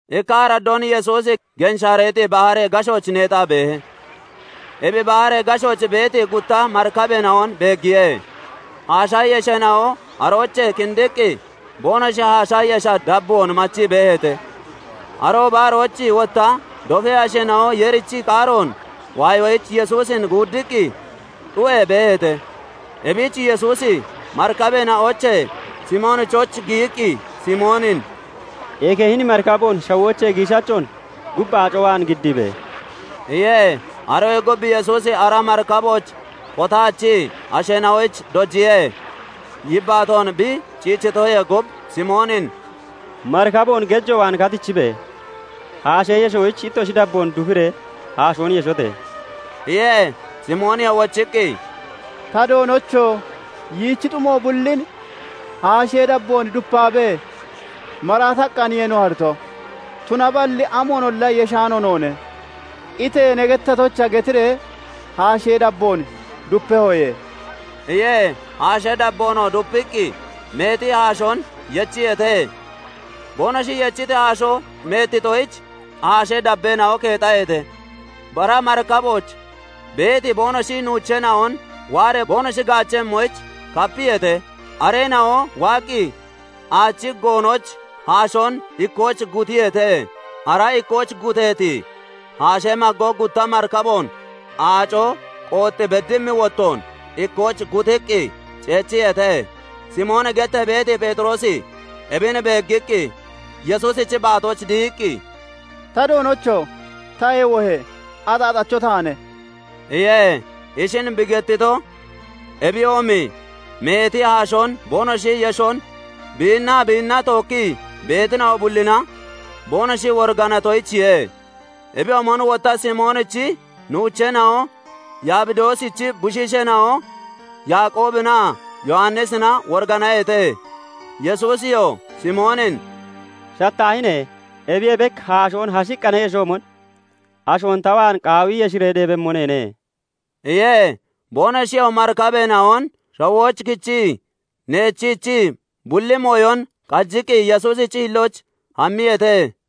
Ikka araddoon Yesuusi Genshaareexi Baharee gashooch neexaa beehe; ebi baharee gashooch beeti gutta marikabeena'on beeggiye. Haasha yesheena'oo aroochee kindiqqi boonoshi haasha yesha dabboon aacona machii beeheete. Arooba arooch wotta dofee asheena'o Yeerichi qaaroon waayoyich Yesuusin guuddiqqi xu'ee beeheete. Ebich Yesuusi marikabeena'oochee Simoonichooch giyiqqi Simoonin "Eke hini marikaboon shawoochee giishachoon gub aaco waan giddiibe!" iye. Aroyee gub Yesuusi ara marikabooch kotaachii asheena'oyich dojiye. Yibbaatoon bi ciichitoyee gub, Simoonin "Marikaboon gejo waan katichibe! Haashee yeshoyich ittoshi dabboon dufiree haashoon yeshote!" iye. Simooniyoo wochiqqi, "Ta Doonocho! yichi xumo bullin haashee dabboon dupaabee maraataqqaaniye no hariito; tunaballi amoonolla yeshaano noone. Itee ne gettatoyicha getiree haashee dabboon dupehoye" iye. Haashee dabboonoo dupiqqi meeti haashoon yechiyeete; boonoshi yechiti haashoo meettitoyich haashee dabbeena'o keexaheete. Bara marikabooch beeti boonoshi nuucheena'on waaree boonoshi gaachemmoyich kapiyeete. Areena'oo waaqqi aachi goonooch haashoon ikkooch gutiyeete; ara ikkooch gutteeti haashee maggo gutta marikaboon aaco qoox beddimmi wottoon ikkooch gutiqqi ceechiyeete. Simooni gettee beeti Pheexiroosi ebin beeggiqqi Yesuusichi baatooch dihiqqi, "Ta Doonocho! Tayee wohe! Axaaxacho taane" iye. Ishin bi gettito, ebiyoomi meeti haashoon boonoshi yeshon biinnaa biinna tookkii beetina'o bullina boonoshi woriganatoyichiye. Ebiyoomon wotta Simoonichi nuucheena'o Yabidoosichi bushiisheena'o Yaaqoobinaa Yowannisina woriganaheete. Yesuusiyoo Simoonin "Shattaahine! Ebiyee bek haashoon hashiqqa ne yeshoomon, ashoon ta waan qaawi yeshiree deebemmo neene" iye. Boonoshiyoo marikabeena'on shawooch kichii neechiichii bulli mooyon qajiqqi Yesuusichi hillooch hammiyeete.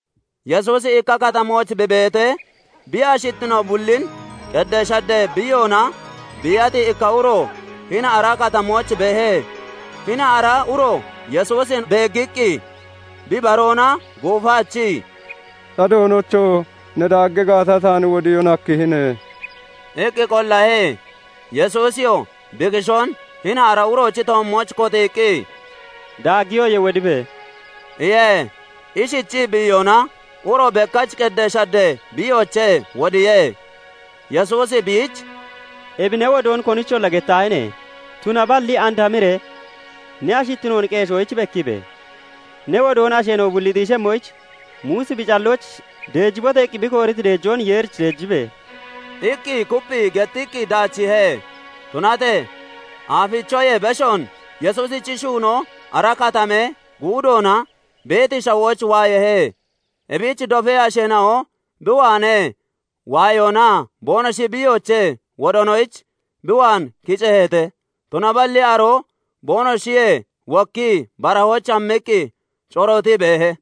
Yesuusi ikka katamooch bi beetee, bi ashittino bullin qeddee shaddee biiyoona biiyati ikka uro hini ara katamooch beehe. Hini ara uroo Yesuusin beeggiqqi bi baroona guufaachii, "Ta Doonocho! Ne daaggi gaata, taan wodiyoon hakkihine" iqqi qollahe. Yesuusiyoo bi kishoon hini ara uroochi toommooch kotiiqqi, "Daaggiyoye; wodibe!" iye. Ishichii bi iyona, uro bekkach qeddee shaddee biiyoochee wodiye. Yesuusi biich "Ebi ne wodoon konicholla gettaahine! tunaballi and hamiree ne ashittinoon qeeshoyich bekkiibe! Ne wodoon asheena'o bulli xiishemmoyich, Muusi bi callooch 'Deejibote!' iqqi bi kooriti deejoon Yeerich deejibe!" iqqi kupphii gettiqqi daachiihe. Tunatee aafichoyee beshoon Yesuusichi shuunoo ara katamee guudoona beeti shawooch waayeehe. Ebich dofee asheena'o bi waanee waayoonaa boonoshi biiyoochee wodoonoyich bi waan kiceeheete; Tunaballi aroo boonoshiyee wokkii barahooch hammiqqi corootii beehe.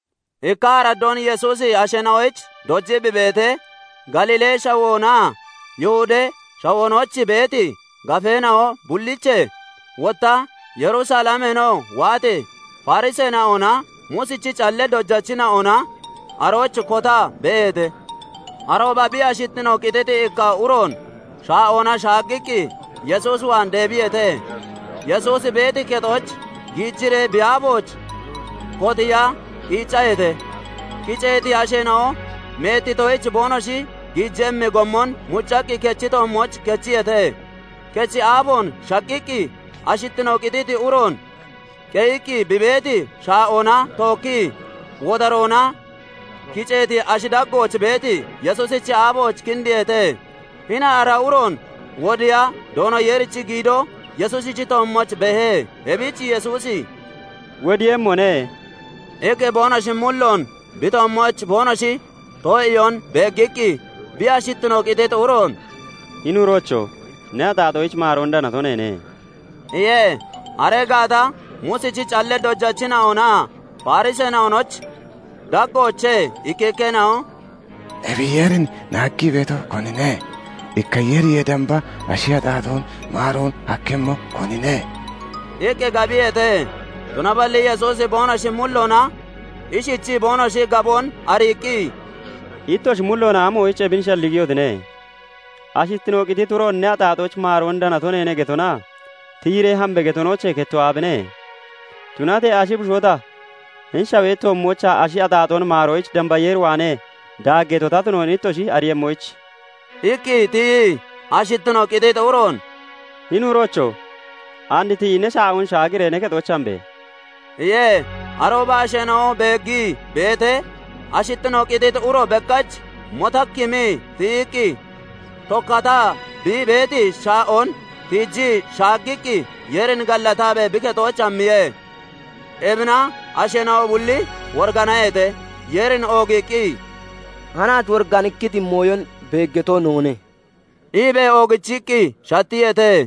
Ikka araddoon, Yesuusi asheena'oyich dojii bi beetee, Galiilee shawoonaa Yihudee Shawoonooch beeti gafeena'o bulliiche, wotta Yerusalemeenoo waati Fariseena'onaa Muusichi callee dojachina'ona arooch kotaa beeheete. Arooba bi ashittino qititi ikka uroon shaa'oona shaaggaqqi Yesuus waan deebiyeete; Yesuusi beeti kexooch giijiree bi aafooch kotiiya qiiccaheete. Kiceeti asheena'o meettitoyich, boonoshi giijemmi gommon muccaqqi kechi toommooch kechiyeete; kechi aafoon shaqqiqqi ashittino qititi uroon qeyiqqi bi beeti shaa'oona tookkii wodaroona kiceeti ashi daggooch beeti Yesuusichi aafooch kindiiheete. Hini ara uroon wodiiya Doono Yeerichi giido Yesuusichi toommooch beehe. Ebich Yesuusi "Wodiiyemmone" iqqi boonoshi mulloon bi toommooch boonoshi too'iyoon beeggiqqi, bi ashittino qititi uroon "Hini uroocho! Ne axaaxoyich maaroon danato neene" iye. Aree gaata Muusichi callee dojachina'onaa Fariseena'onochi daggoochee ikkikkeena'o "Ebi Yeerin naaggii beeto konine? Ikka Yeeriyee damba ashi axaaxoon maaroon hakkemmo konine?" iqqi gabiyeete. Tunaballi Yesuusi boonoshi mulloona ishichii boonoshi gaboon ariiqqi, "Ittoshi mulloona amoyich ebin shalligiyotine? Ashittino qititi uroon 'Ne axaaxoyich maaroon danato neene' getonaa 'Tiyiree hambe!' getonoochee kettoo aabine? Tunatee ashi bushoo ta hini shawee toommoochaa ashi axaaxoon maaroyich, damba Yeer waanee daaggeeto ta tunoon ittoshi ariiyemmoyich..." iqqi tiyii ashittino qititi uroon "Hini uroocho! And tiyi ne shaa'oon shaagiree ne kexooch hambe!" iye. Arooba asheena'o beeggii beetee, ashittino qititi uro bekkach motakkimii tiyiqqi, tokkataa bi beeti shaa'oon tiijii shaaggiqqi Yeerin gallataabee bi kexooch hammiye. Ebina asheena'o bulli woriganaheete; Yeerin oogiiqqi, "Hanaach woriganikkiti mooyon beeggato noone" iibee oogichiqqi shattiyeete.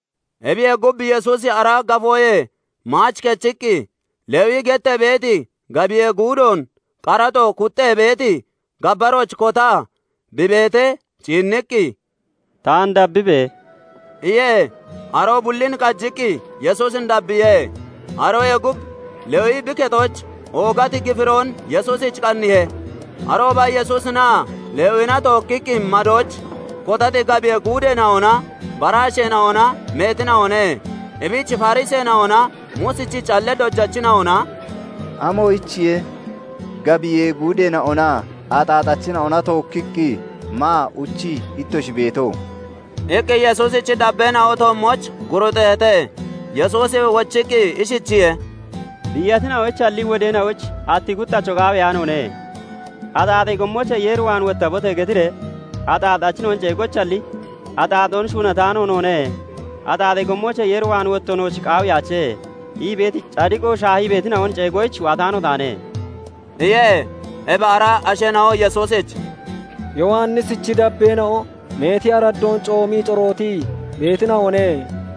Ebiyee gub, Yesuusi ara gafoyee maach kechiqqi, Lewi gettee beeti gabiyee guudoon qaraxo kuxxee beeti gabbarooch kotaa bi beetee ciinniqqi, "Taan dabbibe!" iye. Aroo bullin qajiqqi Yesuusin dabbiye. Aroyee gub Lewi bi kexooch oogati gifiroon Yesuusich qanniihe. Arooba Yesuusinaa Lewina tookkiqqi madooch kotati gabiyee guudeena'onaa bara asheena'ona meetina'one. Ebich Fariseena'onaa Muusichi callee dojachina'ona "Amoyichiye gabiyee guudeena'onaa axaaxachina'ona tookkiqqi maa uchii ittoshi beeto?" iqqi Yesuusichi dabbeena'o toommooch guruuxeeheete. Yesuusi wochiqqi ishichiye:- "Biiyachina'oyichalli wodeena'oyich atti kuxxacho qaaweyaanoone. 'Axaaxee gommoochee Yeer waan wottabote!' getiree axaaxachina'on ceegoyichalli, 'Axaaxoon shuunataano noone; axaaxee gommoochee Yeer waan wotto nooch qaawiyaache' ii beeti cadiqo shaahii beetina'on ceegoyich waataano taane" iye. Ebi ara asheena'o Yesuusich "Yowannisichi dabbeena'o meeti araddoon coomii corootii beetina'one;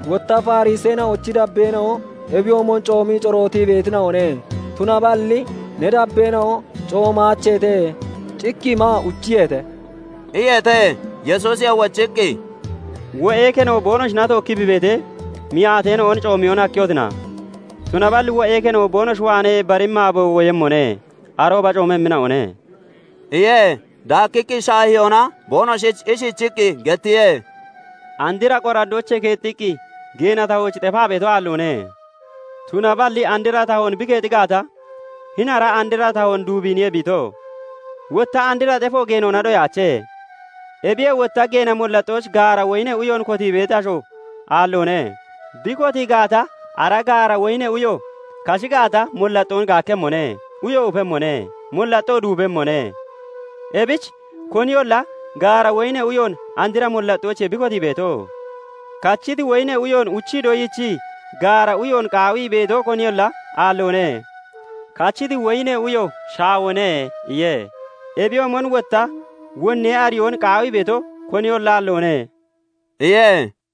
wotta Fariseena'ochi dabbeena'o ebiyoomon coomii corootii beetina'one. Tunaballi ne dabbeena'o coomaacheete; cikkii maa uchiyeete" iyeete. Yesuusiyoo wochiqqi, "Wo'ee keno boonoshina tookkii bi beetee, miyaateena'on coomiyoon hakkehotina? Tunaballi wo'ee keno boonoshi waanee baremmi aabo woyemmone; arooba coomemmina'one" iye. Daakkiqqi shaahiyoona boonoshich ishichiqqi gettiye:- "Andira qoraddoochee keexxiqqi geena tahooch xefaa beeto aalloone; tunaballi andra tahoon bi keexi gaata, hini ara andra tahoon duubiiniye bi ito; wotta andra xefo geenoona doyaache. Ebiyee wotta geena mollaxxooch gaara woyinee uyoon kotii beeti asho aalloone; bi kotii gaata, ara gaara woyinee uyo kashi gaata, mollaxxoon gaakkemmone; uyo ufemmone; mollaxxoo duubemmone. Ebich koniyolla gaara woyinee uyoon andra mollaxxoochiye bi kotii beeto. Kachiti woyinee uyoon uchii doyiichii gaara uyoon qaawii beeto koniyolla aalloone; 'Kachiti woyinee uyo shaawone' iye. Ebiyoomon wotta wonnee ariyoon doyiichii hini andra ariyoon qaawii beeto koniyolla aalloone" iye.